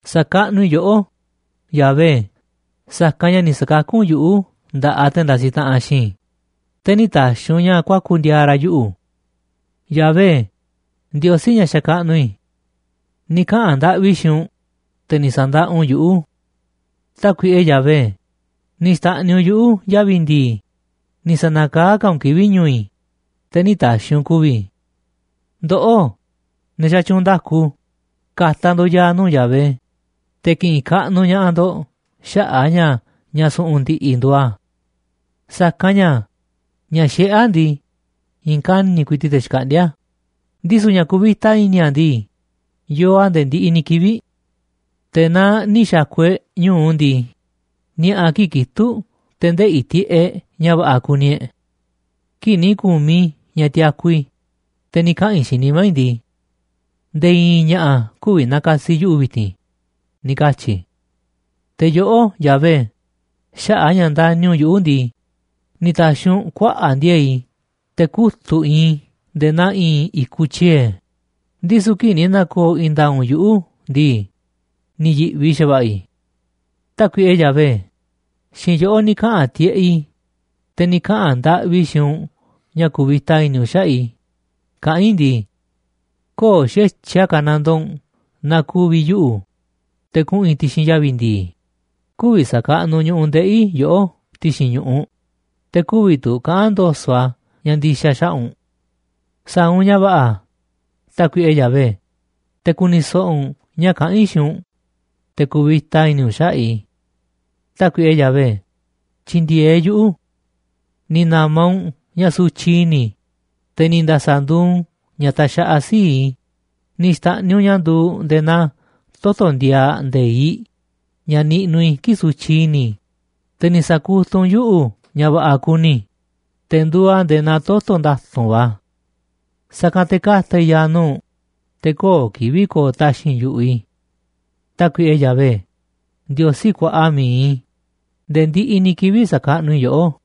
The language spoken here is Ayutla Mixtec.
Sa̱kaꞌnuꞌ i̱ yoꞌó, Yahvé, sa̱kanꞌ ña̱ ni̱ sa̱kakú u̱nꞌ yuꞌu̱ nda̱ꞌaꞌ te̱ ndasiꞌ taꞌanꞌ xiinꞌ i̱, te̱ nï̱ ta̱xi̱ u̱nꞌ ña̱ kuaku̱ ndi̱a̱a̱ ra̱ yuꞌu̱. Yahvé, Ndiosí ña̱ xakaꞌnuꞌ i̱, ni̱ kaꞌa̱n ndaꞌvi i̱ xiinꞌ u̱nꞌ, te̱ ni̱ sa̱ndaꞌa u̱nꞌ yuꞌu̱. Tákuiꞌe Yahvé, ni̱ xta̱ꞌniꞌ u̱nꞌ yuꞌu̱ yavi̱ ndi̱i̱, ni̱ sa̱na̱kaá ka̱ u̱nꞌ kivi̱ꞌ ñu̱u̱ i̱, te̱ nï̱ ta̱xi̱ u̱nꞌ ku̱vi̱ i̱. Ndoꞌó, ne̱ xatyuunꞌ nda̱ku, ka̱ta̱ ndo̱ꞌ ya̱a̱ nuu̱ꞌ Yahvé, te̱ ki̱ꞌi̱n kaꞌnuꞌ ña̱ꞌaꞌ ndo̱ꞌ xaꞌa̱ꞌ a̱ ña̱ ña̱ su̱ꞌu̱n ndi̱ꞌi̱ nduuꞌ a̱. Sa̱kanꞌ ña̱ ña̱ xiꞌé a̱ ndii, i̱i̱n kani̱ꞌ ku̱i̱ti̱ꞌ te̱ xkaꞌndíá a̱, ndisu̱ ña̱ kuvita i̱ni̱ a̱ ndii, yoo a̱ nde̱e̱ ndiꞌiꞌ ni̱ kivi̱ꞌ. Te̱ naaꞌ ni̱ xa̱ku̱ e̱ꞌ ñu̱u ndii, ni̱a̱ꞌa̱ kii̱ꞌ kitu̱ꞌ te̱ ndeꞌi̱ tiꞌeꞌ e̱ꞌ ña̱ va̱ꞌa̱ kuni e̱ꞌ. Kii̱ꞌ ni̱ ku̱miꞌ i̱ ña̱ tiaku i̱, te̱ ni̱ kaꞌa̱n i̱ xiinꞌ nimá i̱ ndii: “Nde̱e̱ i̱i̱n ña̱ꞌa̱ kü̱vi̱ na̱ka̱si̱ yuꞌu̱ vi̱ti̱n”, ni̱ katyi̱ i̱. Te̱ yoꞌó, Yahvé, xaꞌa̱ꞌ a̱ ña̱ ndani̱ u̱nꞌ yuꞌu̱ ndii, ni̱ ta̱xi̱ u̱nꞌ kuaꞌa̱ꞌ ndi̱e̱e̱ꞌ i̱ te̱ kutu̱ꞌ iinꞌ i̱ nde̱e̱ naa i̱i̱n i̱kuꞌ tyiee̱, ndisu̱ kii̱ꞌ ni̱ na̱ko̱o̱ i̱i̱n nda̱a̱ꞌ u̱nꞌ yuꞌu̱ ndii, ni̱ yi̱ꞌvi xa̱va̱ꞌa̱ i̱. Tákuiꞌe Yahvé, xiinꞌ yoꞌó ni̱ kaꞌa̱n tiꞌeꞌ i̱, te̱ ni̱ kaꞌa̱n ndaꞌvi i̱ xiinꞌ u̱nꞌ ña̱ ku̱vi̱ta i̱ni̱ u̱nꞌ xaꞌa̱ꞌ i̱, kaꞌán i̱ ndii: “Köo̱ꞌ xa̱tyiꞌ a̱ ka̱nandoo u̱nꞌ naaꞌ ku̱vi̱ yuꞌu̱, te̱ kuꞌu̱n i̱ ti̱xi̱n yavi̱ ndi̱i̱, kü̱vi̱ sa̱kaꞌnuꞌ ñu̱ꞌuꞌ ndeꞌi̱ i̱ yoꞌó ti̱xi̱n ñu̱ꞌuꞌ, te̱ kü̱vi̱ tu̱ kaꞌa̱n ndo̱so̱ꞌ a̱ ña̱ ndi̱xa̱ xaꞌa̱ꞌ u̱nꞌ. Sa̱a̱ u̱nꞌ ña̱ va̱ꞌa̱, Tákuiꞌe Yahvé, te̱ ku̱ni̱ so̱ꞌo̱ u̱nꞌ ña̱ kaꞌán i̱ xiinꞌ u̱nꞌ, te̱ ku̱vi̱ta i̱ni̱ u̱nꞌ xaꞌa̱ꞌ i̱. Tákuiꞌe Yahvé, tyi̱ndi̱e̱eꞌ yuꞌu̱.” Ni̱ na̱ma̱ u̱nꞌ ña̱ sutyiꞌ i̱ni̱ i̱, te̱ ni̱ nda̱sa̱ nduuꞌ u̱nꞌ ña̱ taxaꞌaꞌ sii̱ꞌ i̱, ni̱ xta̱ꞌniꞌ u̱nꞌ ña̱ nduuꞌ nde̱e̱ naa toto̱ ndiaaꞌ nde̱iꞌ ña̱ niꞌnuꞌ i̱ kii̱ꞌ sutyiꞌ i̱ni̱ i̱, te̱ ni̱ sa̱kutuꞌ u̱nꞌ yuꞌu̱ ña̱ va̱ꞌa̱ kuni i̱, te̱ nduuꞌ a̱ nde̱e̱ naa toto̱ nda̱tu̱nꞌ va̱. Sa̱kanꞌ te̱ ka̱ta̱ i̱ ya̱a̱ nuu̱ꞌ u̱nꞌ, te̱ köo̱ꞌ kivi̱ꞌ ko̱o̱ taxi̱nꞌ yu̱ꞌuꞌ i̱. Tákuiꞌe Yahvé, Ndiosí kuaꞌa mi̱iꞌ i̱, nde̱e̱ ndiꞌiꞌ ni̱ kivi̱ꞌ sa̱kaꞌnuꞌ i̱ yoꞌó.